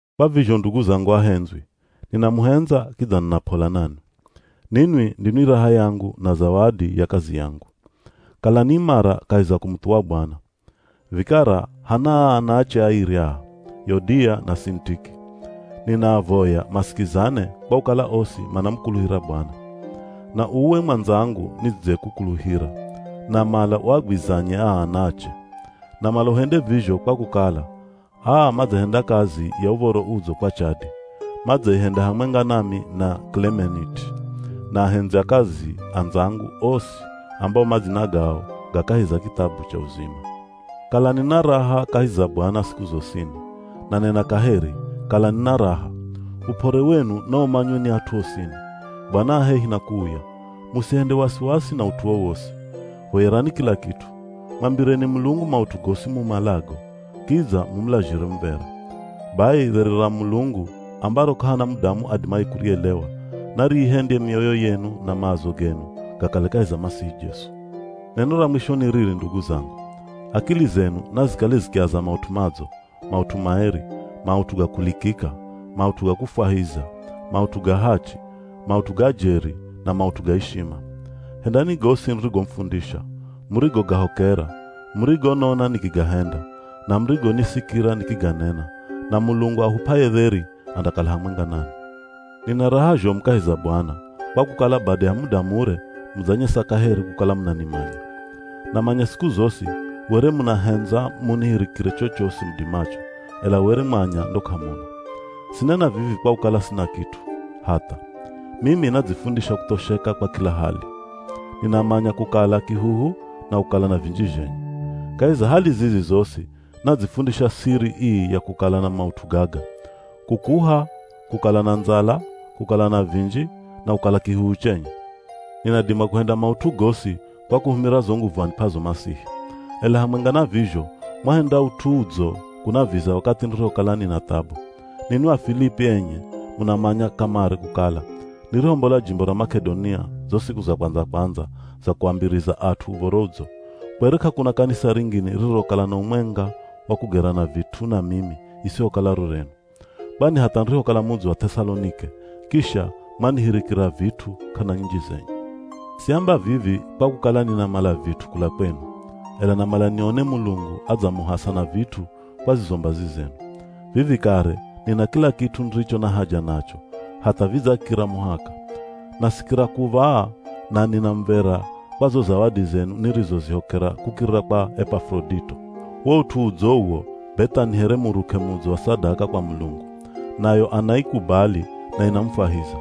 Kwa vizho ndugu zangu ahendzwi, ninamuhendza kidza nina p'ola nanwi. Ninwi ndinwi raha yangu na zawadi ya kazi yangu. Kalani imara kahi za kumuthuwa Bwana. Vikara hana aa ana ache airi aa, Yodiya na Sinitiki, ninaavoya masikizane kwa kukala osi manamukuluhira Bwana. Na uwe mwandzangu nidzekukuluhira, namala uagwizanye aa ana ache. Namala uhende vizho kwa kukala, aa madzahenda kazi ya Uv̱oro Udzo kwa chadi. Madzaihenda hamwenga nami na Kilemeniti na ahendzi a kazi andzangu osi ambao madzina gao ga kahi za kithabu cha uzima. Kalani na raha kahi za Bwana siku zosini, nanena kaheri, kalani na raha. Up'ore wenu naumanywe ni at'u osini. Bwana a hehi na kuuya. Musihende wasiwasi na ut'u wowosi. Voyerani kila kit'u. Mwambireni Mulungu maut'u gosi mumalago, kidza mumulazhire muv̱era. Bai dheri ra Mulungu ambaro k'ahana mudamu adimaye kurielewa nariihendye mioyo yenu na maazo genu gakale kahi za Masihi Jesu. Neno ra mwisho ni riri ndugu zangu: Akili zenu nazikale zikiaza maut'u madzo, maut'u maeri, maut'u ga kulikika, maut'u ga kufwahiza, maut'u ga hachi, maut'u ga jeri na maut'u ga ishima. Hendani gosi nirigomufundisha, murigogahokera, murigonona nikigahenda, na murigonisikira nikiganena, na Mulungu ahup'aye dheri andakala hamwenga nanwi. Nina raha zhomu kahi za Bwana, kwa kukala bada ya muda mure mudzanyesa kaheri kukala munanimanya. Namanya siku zosi were munahendza munihirikire chochosi mudimacho, ela were mwanya ndo k'amuna. Sinena vivi kwa kukala sina kit'u, hatha! Mimi nadzifundisha kuthosheka kwa kila hali. Ninamanya kukala kihuhu na kukala na vinji zhenye. Kahi za hali zizi zosi nadzifundisha siri ii ya kukala na maut'u gaga: Kukuha, kukala na ndzala, kukala na vinji na kukala kihuhu chenye. Ninadima kuhenda maut'u gosi kwa kuhumira zo nguvu anip'azo Masihi. Ela hamwenga na vizho mwahenda ut'u udzo kunaviza wakathi nirihokala nina thabu. Ninwi Afilipi enye munamanya kamare kukala, nirihombola jimbo ra Mak'edonia zo siku za kwandza-kwandza za kuambiriza at'u Uv̱oro Udzo, kwere k'akuna kanisa ringine ririrokala na umwenga wa kugerana vit'u na mimi isihokala ro renu. Kwani hatha nirihokala mudzi wa Th'esalonike, kisha mwanihirikira vit'u k'ana nyinji zenye. Siamba vivi kwa kukala ninamala vit'u kula kwenu, ela namala nione Mulungu adzamuhasa na vit'u kwa zizo mbazi zenu. Vivi kare nina kila kit'u niricho na haja nacho, hatha vidzakira muhaka. Nasikira kuv̱aa, na nina muv̱era kwa zo zawadi zenu nirizozihokera kukirira kwa Epafurodito. Wo ut'u udzo uwo be tha ni here muruk'e mudzo wa sadaka kwa Mulungu. Nayo anaikubali na inamufwahiza.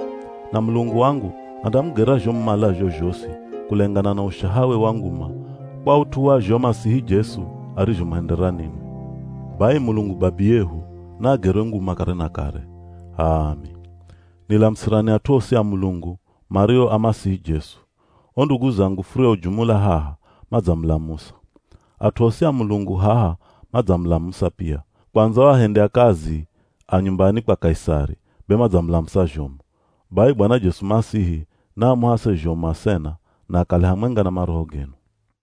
Na Mulungu wangu andamugera zho mumalazho zhosi kulengana na ushahawe wa nguma kwa ut'u wa zho Masihi Jesu arizhomuhendera ninwi. Bai Mulungu Babiyehu naagerwe nguma kare na kare. H'aami. Nilamusirani at'u osi a Mulungu mario a Masihi Jesu. O ndugu zangu furiojumula haha, madzamulamusa. At'u osi a Mulungu haha madzamulamusa pia, kwandza o ahendi a kazi a nyumbani kwa Kaisari be madzamulamusa zhomu. Bai Bwana Jesu Masihi naamuhase zhomu asena na akale hamwenga na maroho genu.